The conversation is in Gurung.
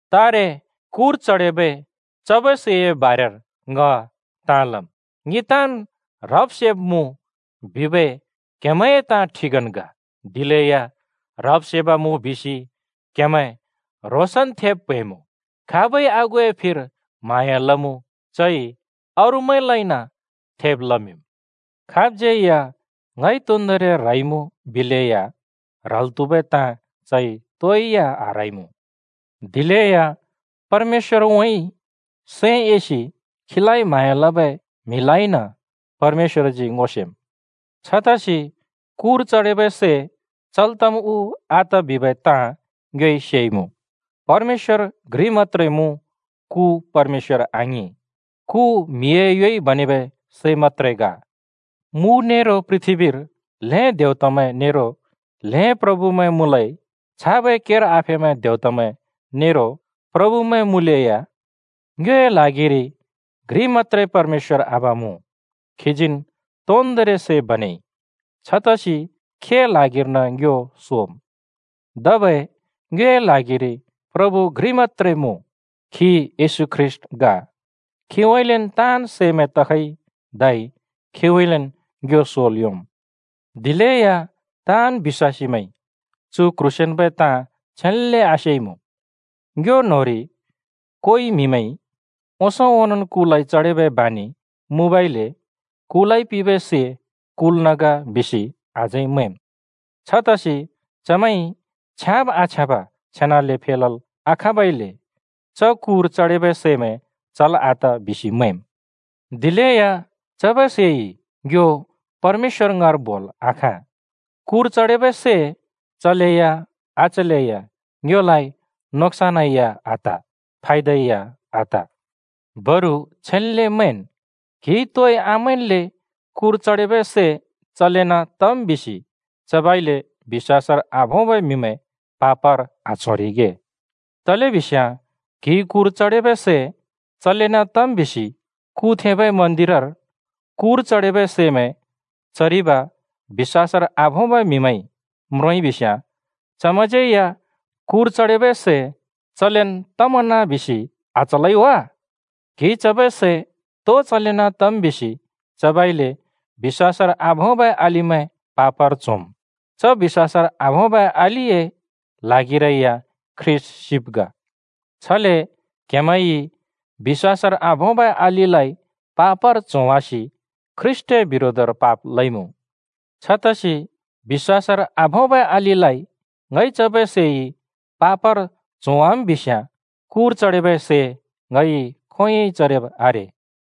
तारे कुर चडेबै चबै सैए बारेर ङ ताँ लम्। “ङि ताँन् ह्रब-सेब् मुँ” बिबै क्हेमैंए ताँ ठिकन् ग। दिलेया ह्रब-सेब् मुँ बिसि क्हेमैं ह्रोंसन् थेब् प्हैंइमुँ, खाबइ आगुए फिर म्हाँया लमुँ, चइ अरूमैंलाइन थेब् लमिंम्। खाबज्‍यै या “ङइ तोन्दोंरि ह्रइमुँ” बिलेया ह्रल् त्‍हुबै ताँ चइ तोइ या आह्रइमुँ। दिलेया परमेश्‍वरउँइँ सैं एसि खीलाइ म्हाँया लबै म्हिलाइन परमेश्‍वरजी ङो सेम्। छतसि कुर चडेबै सै चल् तम् उ आत बिबै ताँ ङ्योइ सेइमुँ, “परमेश्‍वर घ्रि मत्‍त्रे मुँ, कु परमेश्‍वर आङिं।” कु म्हिए योइ बनेबै सै मत्‍त्रे ग। मु नेरो पृथ्‍बीर ल्हें “देवतामैं” नेरो ल्हें “प्रभुमैं” मुँलै। छाबै केर आफेबै देवतामैं नेरो प्रभुमैं मुँलेया ङ्योए ल्हागिरि घ्रि मत्‍त्रे परमेश्‍वर आबा मुँ। खीजीन् तोन्दोंरि सै बनेइ, छतसि खीए ल्हागिर्न ङ्यो सोम्। धबै ङ्योए ल्हागिरि प्रभु घ्रि मत्‍त्रे मुँ, खी येशू ख्रीष्‍ट ग। खीउँइँलेन् ताँन् सैमैं तखइ, धै खीउँइँलेन् ङ्यो सोल् योंम्। दिलेया ताँन् बिश्‍वासीमैंइ चु क्ह्रोंसेंन्बै ताँ छेन्‍ले आसेइमुँ। ङ्यो न्‍होंरि कोइ म्‍हिमैंइ ओंसों ओनोंन् कुलाइ चडेबै बानि मुँबइले “कुलाइ पिंबै सै कुल्न ग” बिसि अझै मैंम्। छतसि चमैंइ छ्याँब आछ्याँब छेनाले फेलल् आखाँबइले च कुर चडेबै सैमैं चल् आत बिसि मैंम्। दिलेया चबै सैइ ङ्यो परमेश्‍वरए ङाँर बोल् आखाँ। कुर चडेबै सै चलैया आचलैया ङ्योलाइ नोक्‍सानै आत, फायदै आत। बरु छेन्ले मैंन्! क्हिइ तोइ आमैंन्ले कुर चडेबै सै चलेन् तम् बिसि चबइले बिश्‍वासर आभोंबै म्हिमैं पापर आच्होरिगे। तलेबिस्याँ क्‍हिइ कुर चडेबै सै चलेन् तम् बिसि कु थेंबै मन्‍दिरर कुर चडेबै सैमैं चरिब बिश्‍वासर आभोंबै म्हिमैंइ म्रोंइ बिस्याँ चमैंज्‍यै या कुर चडेबै सै चलेन् तमना बिसि आचलै वा? क्हिइ चबै सै तो चलेन् तम् बिसि चबइले बिश्‍वासर आभोंबै अलिमैं पापर च्होम्। च बिश्‍वासर आभोंबै अलिए ल्हागिरै या ख्रीष्‍ट सिब् ग। छले क्हेमैंइ बिश्‍वासर आभोंबै अलिलाइ पापर च्होवासि ख्रीष्‍टए बिरोधर पाप लइमुँ। छतसि बिश्‍वासर आभोंबै अलिलाइ ङइ चबै सैइ पापर च्होवाम् बिस्‍याँ, कुर चडेबै सै ङइ खोंयोंइ चरिब् आरे।